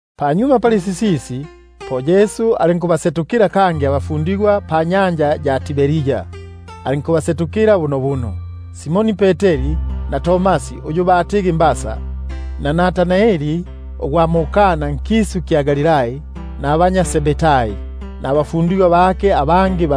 Panyuma pali sisisi, po Yesu alinkubasetukila kangi abafundigwa bake panyanja ya Tiberia; alinkubase- tukila bo bunobuno. Bali pamopene na Simoni Peteri, na Tomasi uyu batigi Didimo, na Natanaeli gwa mu-Kana nkisu kya Galilai, nabanya Zebedai, nabafundigwa bake abangi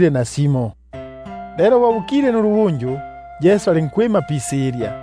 nasimo. Lelo bo bukile nulubunju, Yesu alinkwima pisilya;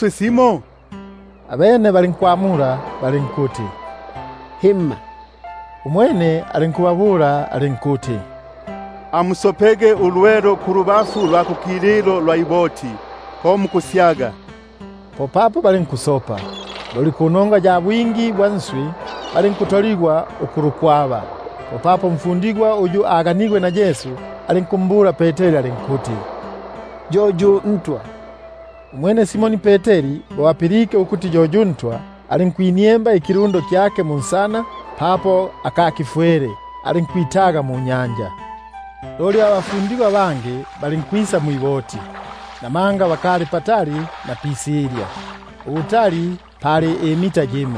kulya? Abene balinkumwamula balinkuti: Himma. Umwene alinkubabula alinkuti: Amusopege ulwelo kulubafu lwa kukililo lwa iboti, po mukusyagaga. Popapo balinkusopa; loli panongwa ya bwingi bwa nswi, balinkutoligwa ukulu- kwaba. Popapo umfundigwa uyu Yesu alinganile, alinkumbula Peteri alinkuti: Yo yu Ntwa! Umwene Simoni Peteri bo apilike ukuti yo yu Ntwa, alinkwiniemba ikilundo kyake munsana, namanga ali itolo igya kufwala, alinkwitaga munya- nja. Loli abafundigwa abangi balinkwisa mwiboti, namanga bakali patali na pisilya, ubutali pikufwana pali ifuti imia ibili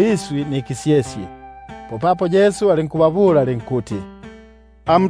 iswi nikisyesye. Popapo Yesu alinkubabula alinkuti: Amu-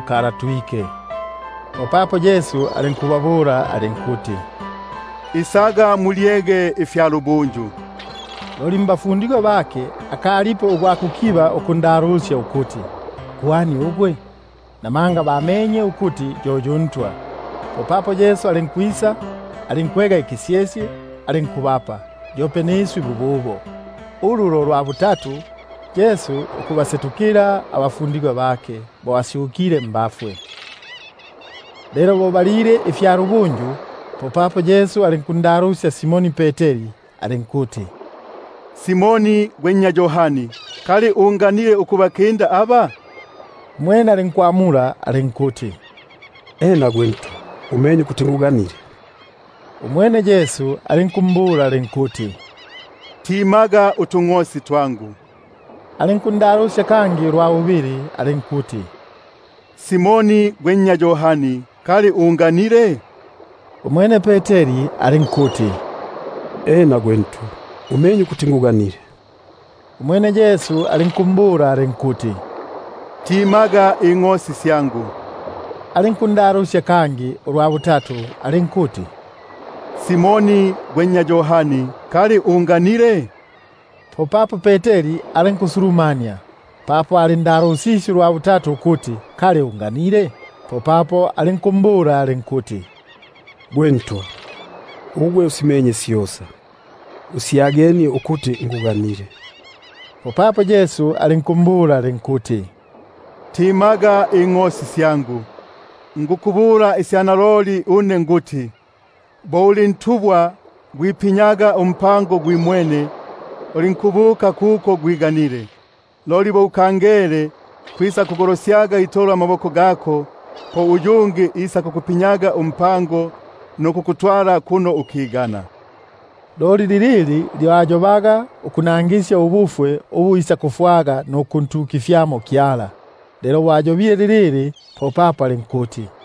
sita nukulatuka. Popapo Yesu alinkubabula alinkuti: Isaga mulyege ifya lubunju. Loli mbafundigwa bake, akalipo nayumo ugwa kukiba ukundalusya ukuti: Gwani ugwe? Na- manga bamenye ukuti yo yu Ntwa. Popapo Yesu alinkwisa, alinkwega ikisyesye, alinkubapa, yope niswi bububo. Ulu lo lwa butatu Yesu ukubasetukila abafundigwa bake, bo asyukile mbafwe. Lelo bo balile ifya lubunju, popapo Yesu alinkundalusya Simoni Peteri alinkuti: Simoni gwe nnya Yohani, kali unganile ukubakinda aba? Umwene alinkumwamula alinkuti: Ena gwe Ntwa, umenye ukuti tumanyene. Umwene alinkumbula alinkuti: Swilaga utungʼosi twangu. Alinkundalusya kangi ulwa bubili alinkuti: Simoni gwe nnya Yohani, kali unganile? Umwene alinkuti: Ena gwe Ntwa, umenye ukuti tumanyene. Umwene alinkumbula alinkuti: Timaga ingʼosi syangu. Alinkundalusya kangi ulwa butatu alinkuti: Simoni gwe nnya Yohani, kali tumanyene? Popapo Peteri alinkusulumania, papo alindalusisye ulwa butatu ukuti: Kali tumanyene? Popapo alinkumbula alinkuti: Gwe Ntwa, ugwe usimenye syosa; usyagenie ukuti tumanyene. Popapo Yesu alinku- mbula alinkuti: Swilaga ingʼosi syangu. Naloliloli nikukubula une nikuti: Apa gwali nkekepo gwifundikililaga umpango gwimwene, ulinkubuka kuko gwiganile; loli bo ukangele, kwisakugolosyaga itolo amaboko gako, po uyungi isakukufu- ndikililaga umpango, nukukutwala kimo ukigana. Loli lilili lyo ayobaga ukunangisya ubufwe ubu ayaga pakuntukifyamo Kyala. Lelo bo ayobile lilili, popapo alinkumbula alinkuti: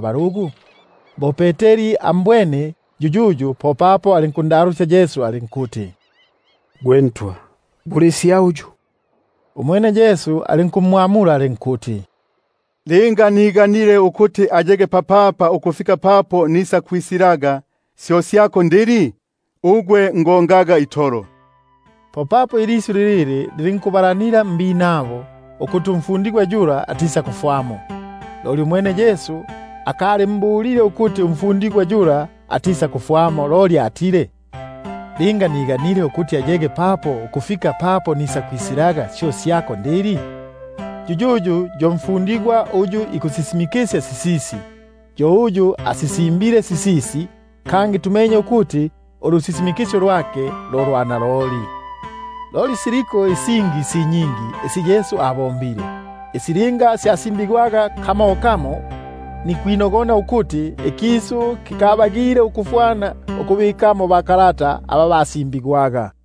balugu?) Bo Peteri ambwene yuyuyu, popapo alinkundalusya Yesu alinkuti: Gwe Ntwa, bule isya uyu? Umwene Yesu alinkumwamula alinkuti: Linga niganile ukuti ayege papapa ukufika papo nikwisilaga, syo syako ndili? Ugwe ngongaga itolo. Popapo ilisyu lilili lilinkubalanila nabinabo, ukuti umfundigwa yula atisakufwamo. Umwene Yesu akalinjobile ukuti atisakufwamo, loli atile: Linga niganile ukuti ayege papapa ukufika papo nikwisilaga, syo syako ndili? Yuyuyu yo mfundigwa uyu ikusisimikisya sisisi, yo uyu asisimbile sisisi, kangi tumenye ukuti ulusisimikisyo lwake lo lwa naloli. Loli siliko isingi si nyingi isi Yesu abombile, isi linga syasimbigwaga kamo kamo, nikwinogona ukuti angali pasobile na pabubiko ba kalata aba basimbigwaga nkisu.